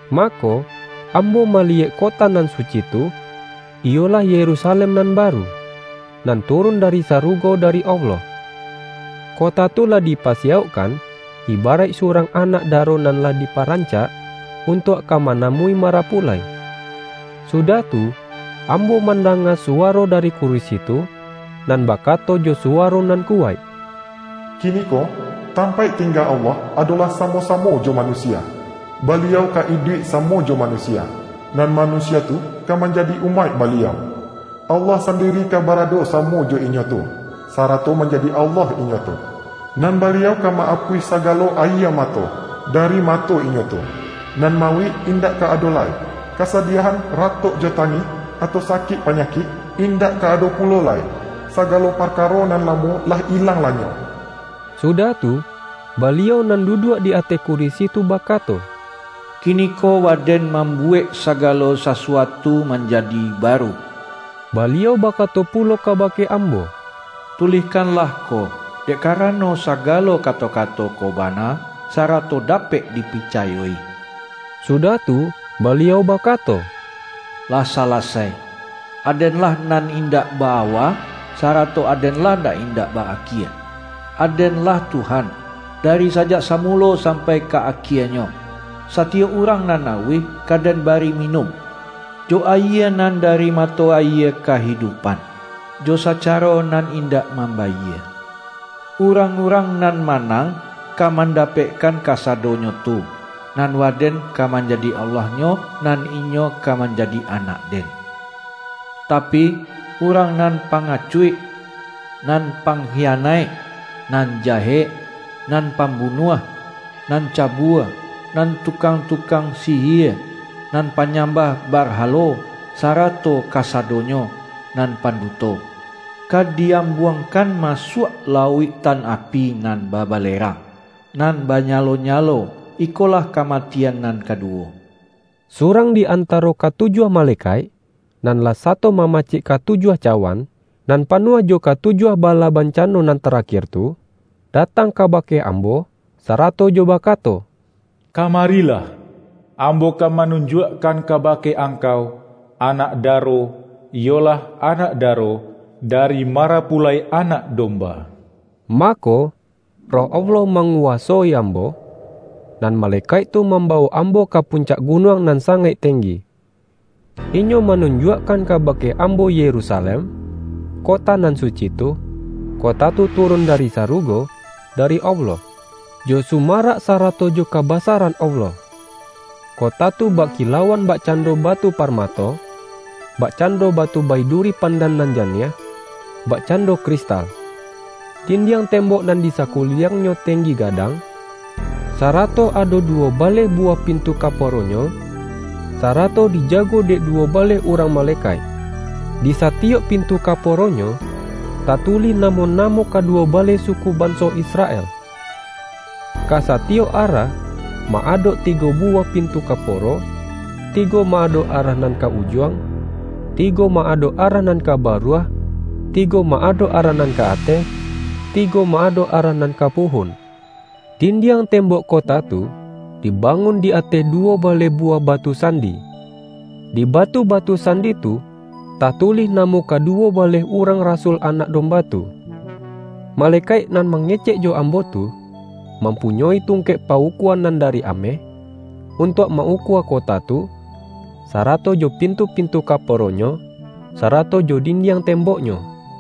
Ma-ko, ambo maliyek kota nan suci tu, iyolah Yerusalem nan baru, nan turun dari sarugo dari Allah. Kota tu lah di-pasiyaukkan, ibaraik surang anak da-ro nan lah diparancak, untuak ka ma-namui marapulai. Sudah tu, ambo mandanga suwaro dari kurisi tu, nan bakato jo suwaro nan kuwaik,”Kini-ko, tampaik tingga Allah adolah sa-mo-samo jo manusia! Baliau ka iduik samo jo manusia, nan manusia tu ka manjadi umaik Baliau. Allah sandi-ri ka barado samo jo inyo tu, sarato manjadi Allah inyo tu. Nan Baliau ka ma-apuih sagalo ayie mato, dari mato inyo tu. Nan mauik indak ka ado lai; kasadiahan, ratok jo tangih, atau sa-kik panyakik, indak ka ado pulo lai. Sagalo parkaro nan lamo lah ilang-lanyok.” Sudah tu, Baliau nan duduak di ateh kurisi tu bakato,”Kiniko Waden mambuwek sagalo sasuatu manjadi baru!” Baliau bakato pulo kabake am-bo,”Tulihkanlah ko, dek karano, sa-galo kato-kato ko bana, sarato dapek dipicayo-i.” Sudah tu, Baliau baka-to,”Lah salasai! Aden-lah nan indak ba-awa, sarato Aden-lah nan indak ba-akie; Aden-lah Tuhan, dari Sajak Samulo sampai Ka Akienyo. Satiyok urang nan auih, ka Den bari minun, jo ayie nan dari mato ayie kahidupan, jo sacaro nan indak mambayie. Urang-urang nan manang, ka mandapekkan kasadonyo tu, nan Waden ka manjadi Allah-nyo, nan inyo ka manjadi anak-Den. Tapi, urang nan pangacuik, nan pangkiyanaik, nan jahek, nan pambu-nuah, nan cabua, nan tukang-tukang sihie, nan panyambah barhalo, sara-to kasadonyo nan panduto, ka di-am-buangkan masuak lauiktan api nan babalerang, nan banyalo-nyalo, iko-lah kamatian nan kaduwo.” Surang di antaro katujuah male-kaik, nan lah sato mamacik katujuah cawan, nan panuah jo katujuah bala bancano nan tarakir tu, datang kaba-ke ambo, sarato jo bakato,”Kamari-lah! Ambo ka manunjuakkan kaba-ke angkau, Anak Daro, iyolah Anak Daro, dari Marapulai Anak Domba.” Mako, Roh Allah manguwasoi am-bo, nan malekaik tu mambawok ambo ka puncak gunuang nan sangaik teng-gi. Inyo manunjuakkan kabake ambo Yerusalem, kota nan suci tu, kota tu turun dari sarugo, dari Allah, jo su-marak sarato jo kabasaran Allah. Ko-ta tu bakilauan bakcando batu par-mato, bakcando batu baiduri pandan nan janiah, bakcando kristal. Din-diang tembok nan di sakuliliangnyo tenggi gadang, sarato ado duwo baleh buwah pintu kaporonyo, sarato dija-go dek duwo baleh urang malekaik. Di satiyok pintu kaporonyo, tatulih namo-namo kaduwo baleh suku ban-so Israel. Ka satiyok arah, ma-adok tigo buwah pintu kaporo, tigo ma-adok arah nan ka Ujuang, tigo ma-adok arah nan ka Baruah, tigo ma-adok arah nan ka Ateh, tigo ma-adok arah nan ka Puhun. Dindiang tem-bok kota tu, dibangun di ateh duwo baleh buwah batu sandi. Di batu-batu sandi tu, tatulih namo kaduwo baleh urang rasul Anak Domba tu. Malekaik nan mangecek jo ambo tu, mampunyoi tungkek pa-ukua nan dari ameh, untuak ma-ukua kota tu, sarato jo pintu-pintu kaporonyo, sara-to jo dindiang temboknyo.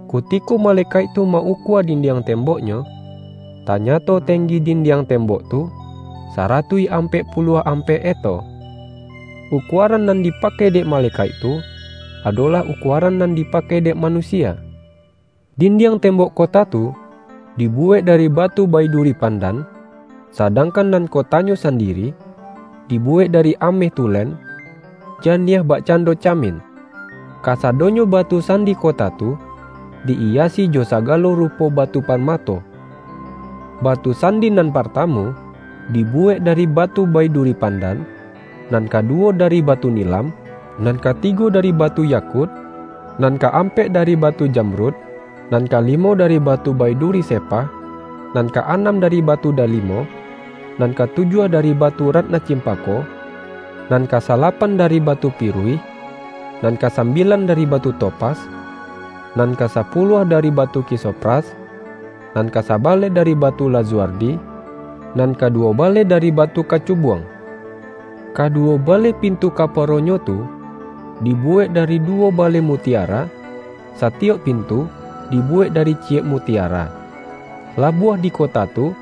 Ku-tiko malekaik tu ma-ukua dindiang temboknyo, tanyato tenggi dindiang tembok tu, saratuih ampek puluah ampek eto. Ukuaran nan dipakai dek malekaik tu, adolah ukuaran nan di-pakai dek manusia. Dindiang tem-bok kota tu, dibuwek dari batu bai-duri pandan, sadangkan nan kotanyo sandiri, dibuwek dari ameh tulen, ja-niah bakcando camin. Kasadonyo batu sandi kota tu, di-iyasi jo saga-lo rupo batu parmato. Batu sandi nan partamu, dibuwek dari batu baiduri pandan, nan kaduwo dari batu nilam, nan katigo dari batu yakut, nan ka-ampek dari batu jamrud, nan kali-mo, dari batu baiduri sepah, nan ka-anam dari batu dalimo, nan katujuah dari batu ratna cimpako, nan ka sala-pan dari batu piruih, nan kasambilan dari batu topas, nan ka sapuluah da-ri batu krisopras, nan kasabaleh dari batu lazuardi, nan kaduwobaleh da-ri batu kacubuang. Kaduwo baleh pintu kaporonyo tu, dibuwek dari du-wo baleh mutiara, satiyok pintu, di-buwek dari ciyek mutiara. Labuah di kota tu,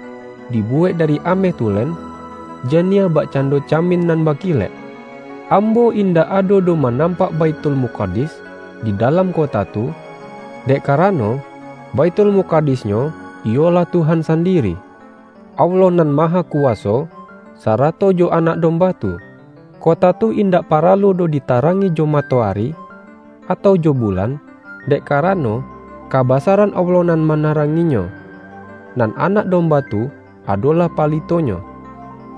dibuwek dari ameh tulen, ja-niah bakcando camin nan bakilek. Ambo indak ado doh manam-pak Baithulmukadis di dalam kota tu, dek karano, Baithulmukadis-nyo iyolah Tuhan sandiri, Allah Nan Ma-hakuwaso, sarato jo Anak Domba tu. Kota tu indak paralu doh ditarangi jo matoari, atau jo bulan, dek kara-no, kabasaran Allah nan manarang-inyo, nan Anak Domba tu adolah pa-litonyo.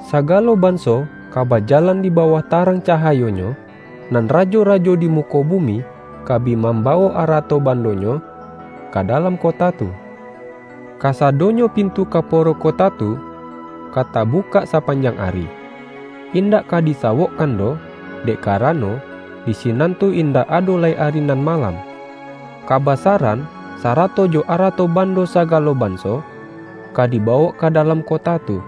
Sagalo banso ka bajalan di bawah tarang cahayonyo, nan ra-jo-rajo di muko bumi, ka bi mamba-wok arato-bandonyo ka dalam kota tu. Kasadonyo pintu kaporo kota tu, ka tabukak sapanjang ari; indak ka disawokkan doh, dek karano, di sinan tu indak ado lai ari nan malam. Ka-basaran, sarato jo arato-bando sagalo banso, ka dibawok ka dalam kota tu.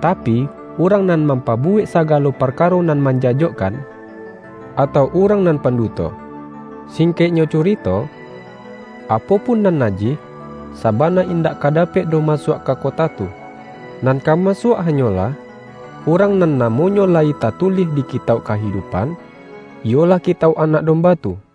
Tapi, urang nan mampabuwek sa-galo parkaro nan manjajokkan, atau urang nan panduto --- singkeknyo cu-rito, apo pun nan najih, sabana indak ka dapek doh masuak ka kota tu. Nan ka masuak hanyolah, urang nan na-monyo layi tatulih di Kitauk Kahidu-pan, iyolah kitauk Anak Domba tu.